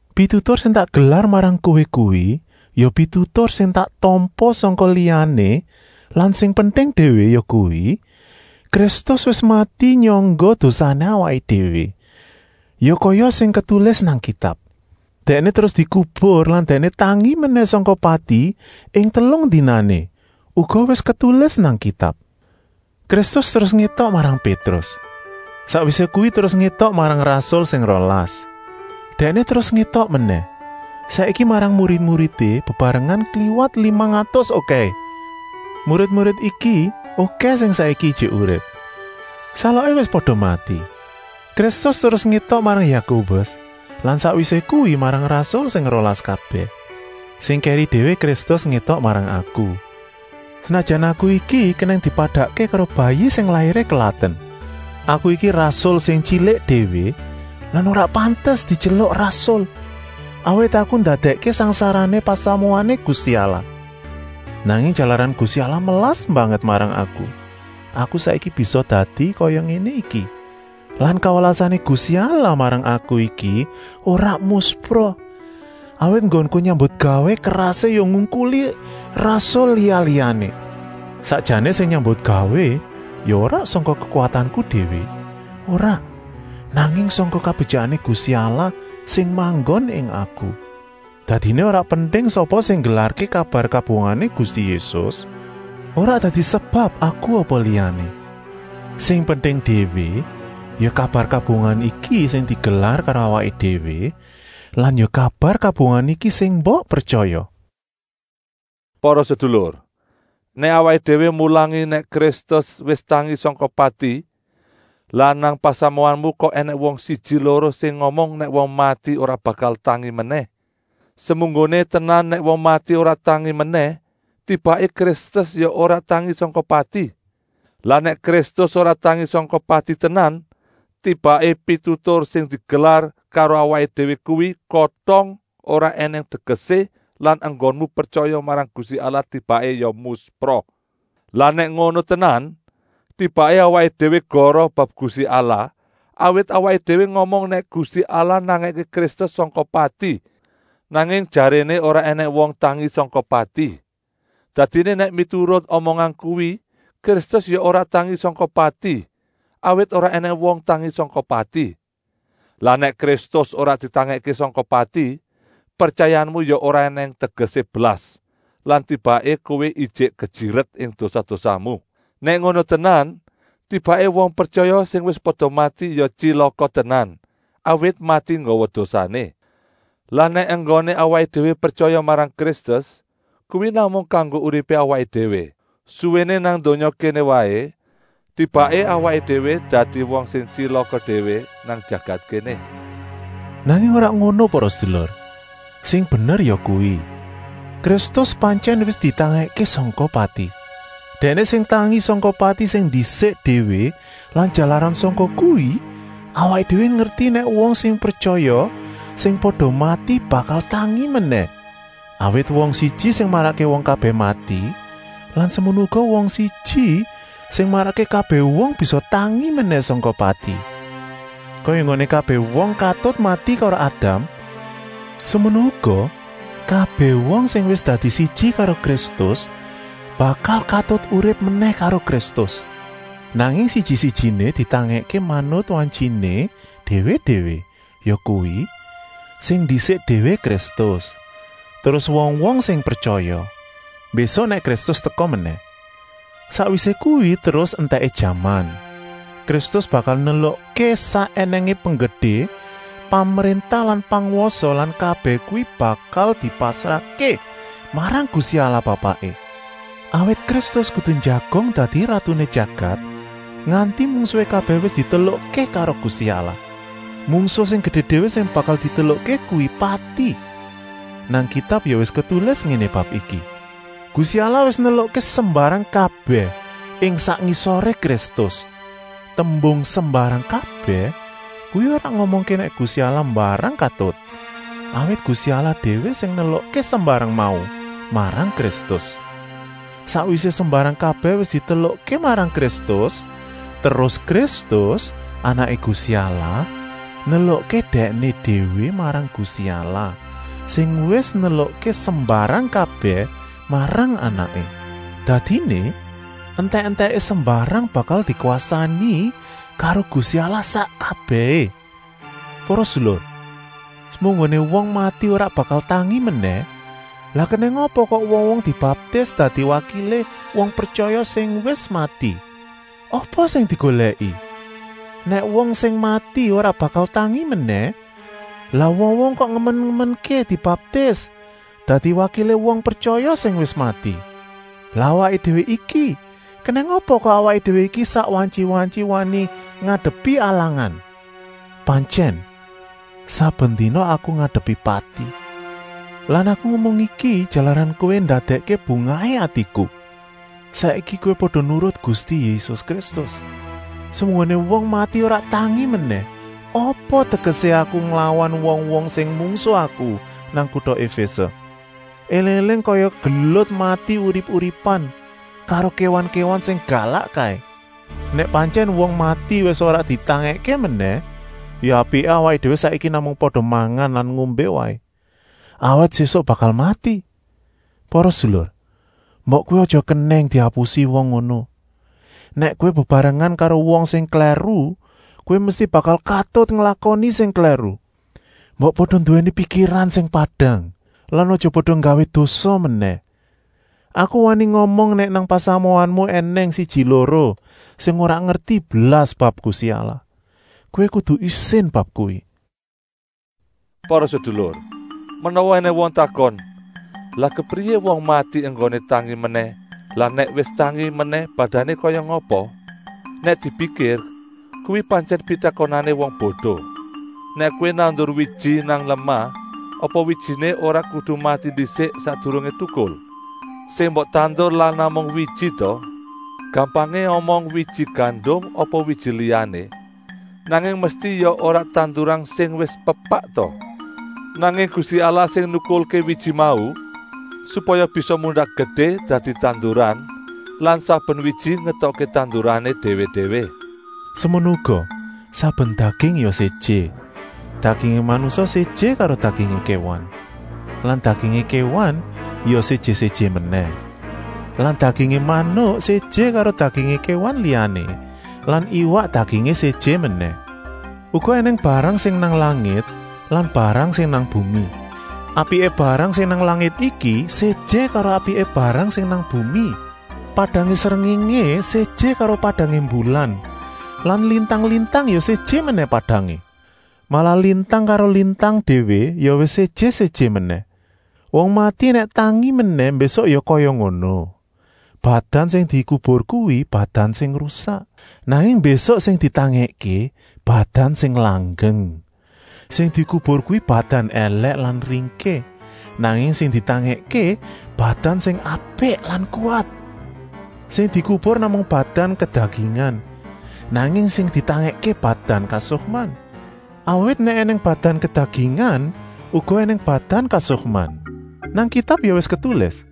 Pitutur sing tak gelar marang kowé kuwi ya pitutur sing tak tampa sangka liyané lan sing penting déwé yakuwi, Kristus wis mati nyangga dosané awaké déwé, ya kaya sing ketulis nang Kitab. Dèkné terus dikubur lan Dèkné tangi menèh sangka pati ing telung dinané, uga wis ketulis nang Kitab. Kristus terus ngétok marang Pétrus, sakwisé kuwi terus ngétok marang rasul sing rolas. Dèkné terus ngétok menèh, saiki marang murid-muridé bebarengan kliwat limang atus okèhé; murid-murid iki okèh sing saiki ijik urip, saloké wis pada mati. Kristus terus ngétok marang Yakobus lan sakwisé kuwi marang rasul sing rolas kabèh. Sing kèri déwé Kristus ngétok marang aku, senajan aku iki kenèng dipadakké karo bayi sing lairé kelaten. Aku iki rasul sing tyilik déwé lan ora pantes dityeluk rasul, awit aku ndadèkké sangsarané pasamuané Gusti Allah. Nanging jalaran Gusti Allah melas banget marang aku, aku saiki bisa dadi kaya ngéné iki. Lan kawelasané Gusti Allah marang aku iki ora muspra, awit enggonku nyambutgawé kerasé ya ngungkuli rasul liya-liyané. Sakjané sing nyambutgawé ya ora sangka kekuwatanku déwé, ora, nanging sangka kabetyikané Gusti Allah sing manggon ing aku. Dadiné ora penting sapa sing nggelarké kabar kabungahané Gusti Yésus, ora dadi sebab aku apa liyané. Sing penting déwé ya kabar kabungahan iki sing digelar karo awaké déwé lan ya kabar kabungahan iki sing mbok pretyaya. Para sedulur, nèk awaké déwé mulangi nèk Kristus wis tangi sangka pati, lah nang pasamuanmu kok ènèng wong siji-loro sing ngomong nèk wong mati ora bakal tangi menèh. Semunggoné tenan nèk wong mati ora tangi menèh, tibaké Kristus ya ora tangi sangka pati. Lah nèk Kristus ora tangi sangka pati tenan, tibaké pitutur sing digelar karo awaké déwé kuwi kotong ora ènèng tegesé lan enggonmu pretyaya marang Gusti Allah tibaké ya muspra. Lah nèk ngono tenan, tibaké awaké déwé goroh bab Gusti Allah, awit awaké déwé ngomong nèk Gusti Allah nangèké Kristus sangka pati, nanging jaréné ora ènèng wong tangi sangka pati. Dadiné nèk miturut omongan kuwi Kristus ya ora tangi sangka pati, awit ora ènèng wong tangi sangka pati. Lah nèk Kristus ora ditangèkké sangka pati, pretyayamu ya ora ènèng tegesé blas lan tibaké kowé ijik kejiret ing dosa-dosamu. Nèk ngono tenan, tibaké wong pretyaya sing wis pada mati ya tyilaka tenan, awit mati nggawa dosané. Lah nèk enggoné awaké déwé pretyaya marang Kristus kuwi namung kanggo uripé awaké déwé suwéné nang donya kéné waé, tibaké awaké déwé dadi wong sing tyilaka déwé nang jagat kéné. Nanging ora ngono para sedulur, sing bener yakuwi: Kristus pantyèn wis ditangèkké sangka pati. Dèkné sing tangi sangka pati sing ndisik déwé lan jalaran sangka kuwi awaké déwé ngerti nèk wong sing pretyaya sing pada mati bakal tangi menèh. Awit wong siji sing marakké wong kabèh mati lan semono uga wong siji sing marakké kabèh wong bisa tangi menèh sangka pati. Kaya enggoné kabèh wong katut mati karo Adam, semono uga kabèh wong sing wis dadi siji karo Kristus bakal katut urip menèh karo Kristus. Nanging siji-sijiné ditangèkké manut wantyiné déwé-déwé, yakuwi: sing ndisik déwé Kristus, terus wong-wong sing pretyaya, mbésuk nèk Kristus teka menèh. Sakwisé kuwi terus entèké jaman. Kristus bakal nelukké sak ènèngé penggedé, pemréntah lan pangwasa lan kabèh kuwi bakal dipasrahké marang Gusti Allah Bapaké. Awit Kristus kudu njagong dadi ratuné jagat nganti mungsuhé kabèh wis ditelukké karo Gusti Allah. Mungsuh sing gedé déwé sing bakal ditelukké kuwi pati. Nang Kitab ya wis ketulis ngéné bab iki: “Gusti Allah wis nelukké sembarang kabèh ing sak ngisoré Kristus.” Tembung “sembarang kabèh” kuwi ora ngomongké nèk Gusti Allah mbarang katut, awit Gusti Allah déwé sing nelukké sembarang mau marang Kristus. Sakwisé sembarang kabèh wis ditelukké marang Kristus, terus Kristus, Anaké Gusti Allah, nelukké Dèkné déwé marang Gusti Allah, sing wis nelukké sembarang kabèh marang Anaké. Dadiné, entèk-entèké sembarang bakal dikwasani karo Gusti Allah sak kabèhé. Para sedulur, semunggoné wong mati ora bakal tangi menèh, lah kenèng apa kok wong-wong dibaptis dadi wakilé wong pretyaya sing wis mati? Apa sing digolèki? Nèk wong sing mati ora bakal tangi menèh, lah wong-wong kok ngemen-ngemenké dibaptis dadi wakilé wong pretyaya sing wis mati? Lan awaké déwé iki, kenèng apa kok awaké déwé iki sak wantyi-wantyi wani ngadepi alangan. Pantyèn, saben dina aku ngadepi pati. Lan aku ngomong iki jalaran kowé ndadèkké bungahé atiku, saiki kowé pada nurut Gusti Yésus Kristus. Semunggoné wong mati ora tangi menèh, apa tegesé aku nglawan wong-wong sing mungsuh aku nang kuta Efése, éling-éling kaya gelut mati-urip-uripan karo kéwan-kéwan sing galak kaé. Nèk pantyèn wong mati wis ora ditangèkké menèh, ya apiké awaké déwé saiki namung pada mangan lan ngombé waé, awit sésuk bakal mati. Para sedulur, mbok kowé aja kenèng diapusi wong ngono. Nèk kowé bebarengan karo wong sing klèru, kowé mesti bakal katut nglakoni sing klèru. Mbok pada nduwèni pikiran sing padang lan aja pada nggawé dosa menèh. Aku wani ngomong nèk nang pasamuanmu ènèng siji-loro sing ora ngerti blas bab Gusti Allah. Kowé kudu isin bab kuwi. Para sedulur, menawa ènèng wong takon: “Lah kepriyé wong mati enggoné tangi menèh lan nèk wis tangi menèh badané kaya ngapa?” Nèk dipikir, kuwi pantyèn pitakonané wong bodo. Nèk kowé nandur wiji nang lemah, apa wijiné ora kudu mati ndisik sakdurungé tukul? Sing mbok tandur lak namung wiji ta, gampangé omong wiji gandum apa wiji liyané, nanging mesti ya ora tanduran sing wis pepak ta? Nanging Gusti Allah sing nukulké wiji mau, supaya bisa mundak gedé dadi tanduran lan saben wiji ngetokké tandurané déwé-déwé. Semono uga, saben daging ya séjé. Dagingé manungsa séjé karo dagingé kéwan. Lan dagingé kéwan ya séjé-séjé menèh. Lan dagingé manuk séjé karo dagingé kéwan liyané lan iwak dagingé séjé menèh. Uga ènèng barang sing nang langit lan barang sing nang bumi. Apiké barang sing nang langit iki séjé karo apiké barang sing nang bumi. Padangé srengéngé séjé karo padangé mbulan lan lintang-lintang ya séjé menèh padangé. Malah lintang karo lintang déwé ya wis séjé-séjé menèh. Wong mati nèk tangi menèh mbésuk ya kaya ngono. Badan sing dikubur kuwi badan sing rusak, nanging mbésuk sing ditangèkké badan sing langgeng. Sing dikubur kuwi badan èlèk lan ringkih, nanging sing ditangèkké badan sing apik lan kuwat. Sing dikubur namung badan kedagingan, nanging sing ditangèkké badan kasukman. Awit nèk ènèng badan kedagingan, uga ènèng badan kasukman. Nang Kitab ya wis ketulis: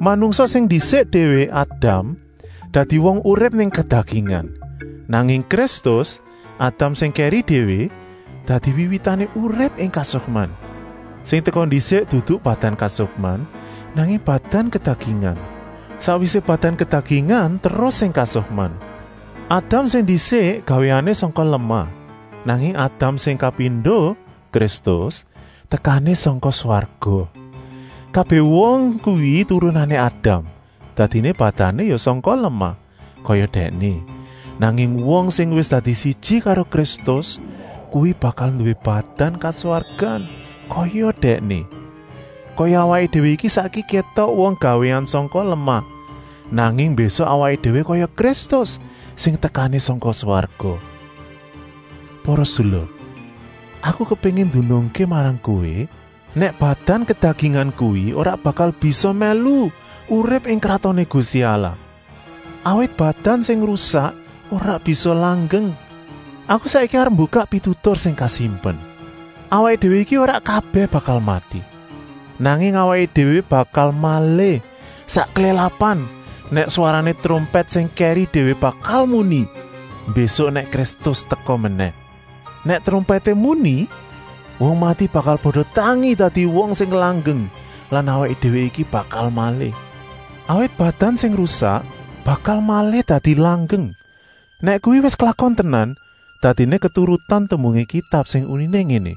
“Manungsa sing ndisik déwé, Adam, dadi wong urip ing kedagingan.” Nanging Kristus, Adam sing kèri déwé, dadi wiwitané urip ing kasukman. Sing teka ndisik dudu badan kasukman, nanging badan kedagingan. Sakwisé badan kedagingan terus sing kasukman. Adam sing ndisik gawéané sangka lemah, nanging Adam sing kapindo, Kristus, tekané sangka swarga. Kabèh wong kuwi turunané Adam, dadiné badané ya sangka lemah, kaya dèkné. Nanging wong sing wis dadi siji karo Kristus kuwi bakal nduwé badan kaswargan, kaya Dèkné. Kaya awaké déwé iki saiki kétok wong gawéan sangka lemah, nanging mbésuk awaké déwé kaya Kristus sing tekané sangka swarga. Para sedulur, aku kepéngin ndunungké marang kowé nèk badan kedagingan kuwi ora bakal bisa mèlu urip ing Kratoné Gusti Allah, awit badan sing rusak ora bisa langgeng. Aku saiki arep mbukak pitutur sing kasimpen: awaké déwé iki ora kabèh bakal mati, nanging awaké déwé bakal malih, sak klélapan, nèk swarané trompèt sing kèri déwé bakal muni, mbésuk nèk Kristus teka menèh. Nèk trompèté muni, wong mati bakal pada tangi dadi wong sing langgeng lan awaké déwé iki bakal malih. Awit badan sing rusak bakal malih dadi langgeng. Nèk kuwi wis klakon tenan, dadiné keturutan tembungé Kitab sing uniné ngéné: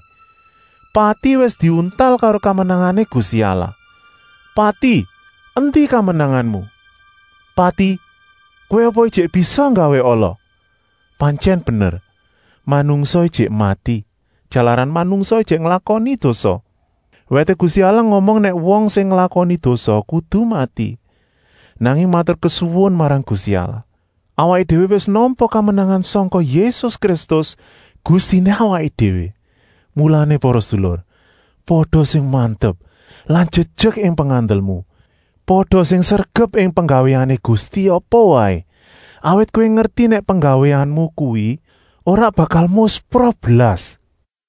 “Pati wis diuntal karo kamenangané Gusti Allah.” “Pati, endi kamenanganmu? Pati, kowé apa ijik bisa nggawé ala?” Pantyèn bener, manungsa ijik mati, jalaran manungsa ijik nglakoni dosa. Wèté Gusti Allah ngomong nèk wong sing nglakoni dosa kudu mati. Nanging maturkesuwun marang Gusti Allah, awaké déwé wis nampa kamenangan sangka Yésus Kristus, Gustiné awaké déwé. Mulané para sedulur, pada sing mantep lan jejek ing pengandelmu. Pada sing sregep ing penggawéané Gusti apa waé, awit kowé ngerti nèk penggawéanmu kuwi ora bakal muspra blas.